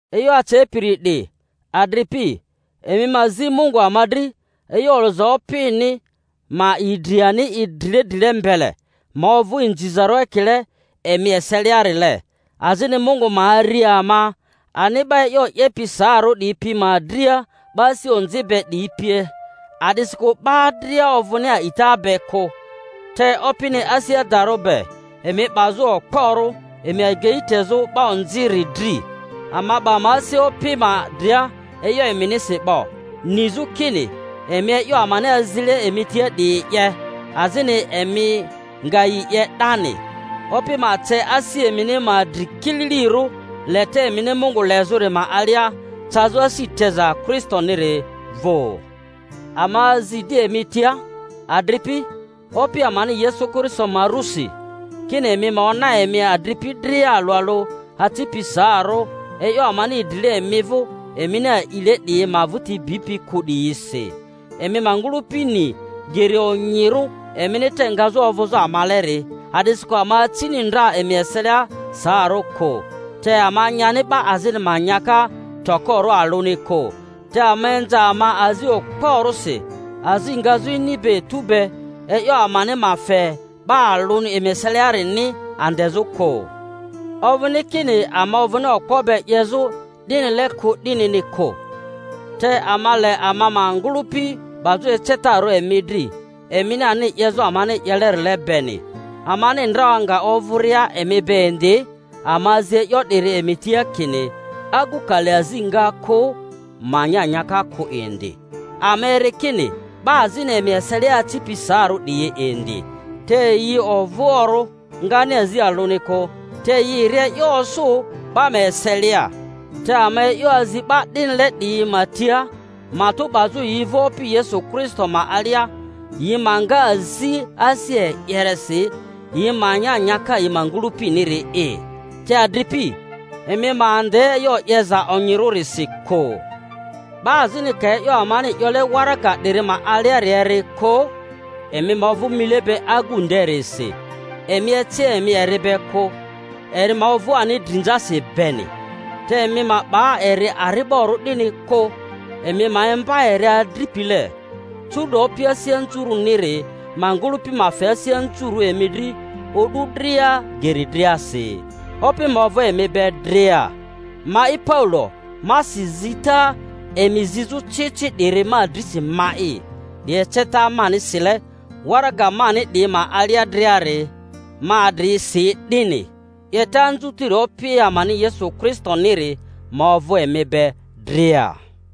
E'yo acepiri 'di, adripi, emi ma zi Mungu ama dri, e'yo olᴜza Opini ma idri i ani drile drile mbele, ma ovᴜ inzizarᴜ ekile emi eseliarile, azini Mungu ma ari ama ani 'ba e'yo 'yepi saarᴜ 'diyi pi ma dria 'ba asi onzi be 'diyi pie; a'disikᴜ 'ba dria ovᴜni a'ita be kᴜ. Te Opini asi adarᴜ be, emi 'bazᴜ okporᴜ, emi agei tezᴜ 'ba onziri dri. Ama 'ba ama asi Opi ma dria e'yo eminisi 'bo, nizᴜ kini emi e'yo amani azile emi tia 'diyi 'ye, azini emi nga yi 'ye 'dani. Opi ma ce asi emini ma dri kililirᴜ leta emini Mungu lezᴜri ma alia, cazᴜ asi teza Kristoniri vᴜ. Ama azi di emi tia, adripi, Opi amani Yesu Kristo ma rᴜsi, kini emi ma ona emi adripi dria alᴜ alᴜ acipi saarᴜ, e'yo amani idrile emi vᴜ emini a'ile 'diyi ma vᴜti bipi kᴜ 'diyisi. Emi ma ngᴜlᴜpi ni geri onyirᴜ emini te ngazᴜ ovᴜzᴜ amaleri; a'disikᴜ ama acini ndra emi eselia saarᴜ kᴜ, te ama nyani 'ba azini ma nyaka tokorᴜ alᴜni kᴜ, te ama inza ama azi okporᴜsi azi ngazᴜ ini be etu be, e'yo amani ma fe 'ba alᴜni emi eseliarini andezᴜ kᴜ. Ovᴜni kini ama ovᴜni okpo be 'yezᴜ 'dinile kᴜ, 'dinini kᴜ, te ama le ama ma ngᴜlᴜpi 'bazᴜ ecetarᴜ emi dri, emini ani 'yezᴜ amani 'yelerile beni. Amani ndra nga ovᴜria emi be indi, ama azi e'yo 'diri emi tia, kini: Agu ka le azi nga kᴜ, ma nya nyaka kᴜ indi. Ama eri kini 'ba azini emi eselia acipi saarᴜ 'diyi indi, te yi ovᴜoᴜrᴜ, ngani azi alᴜni kᴜ, te yi ri e'yo osᴜ 'ba ma eselia. Te ama e'yo azi 'ba 'dinile 'diyi ma tia, matᴜ 'bazᴜ yi vᴜ Opi Yesu Kristo ma alia, yi ma nga azi asi e'yeresi, yi ma nya nyaka yi ma ngᴜlᴜpiniri’i. Te adripi, emi ma ande e'yo 'yeza onyirisi kᴜ. 'Ba azini ka e'yo amani 'yole waraga 'diri ma aliari eri kᴜ, emi ma ovᴜ mile be agu nderisi, emi eci emi eri be kᴜ, eri ma ovᴜ ani drinzasi beni. Te emi ma 'ba eri ari'borᴜ 'dini kᴜ, emi ma imba eri adripile. Curu'do Opi asi anzurᴜiniri ma ngᴜlᴜpi ma fe asi anzurᴜ emi dri o'du dria geri driasi. Opi ma ovᴜ emi be dria. Mai Paulo, ma si zita emi zizᴜ ci ci 'diri ma drisi ma'i. 'Di eceta mani sile waraga mani 'diyi ma alia driari; ma adri si 'dini. 'Yeta anzutiri Opi amani Yesu Kristoniri ma ovᴜ emi be dria.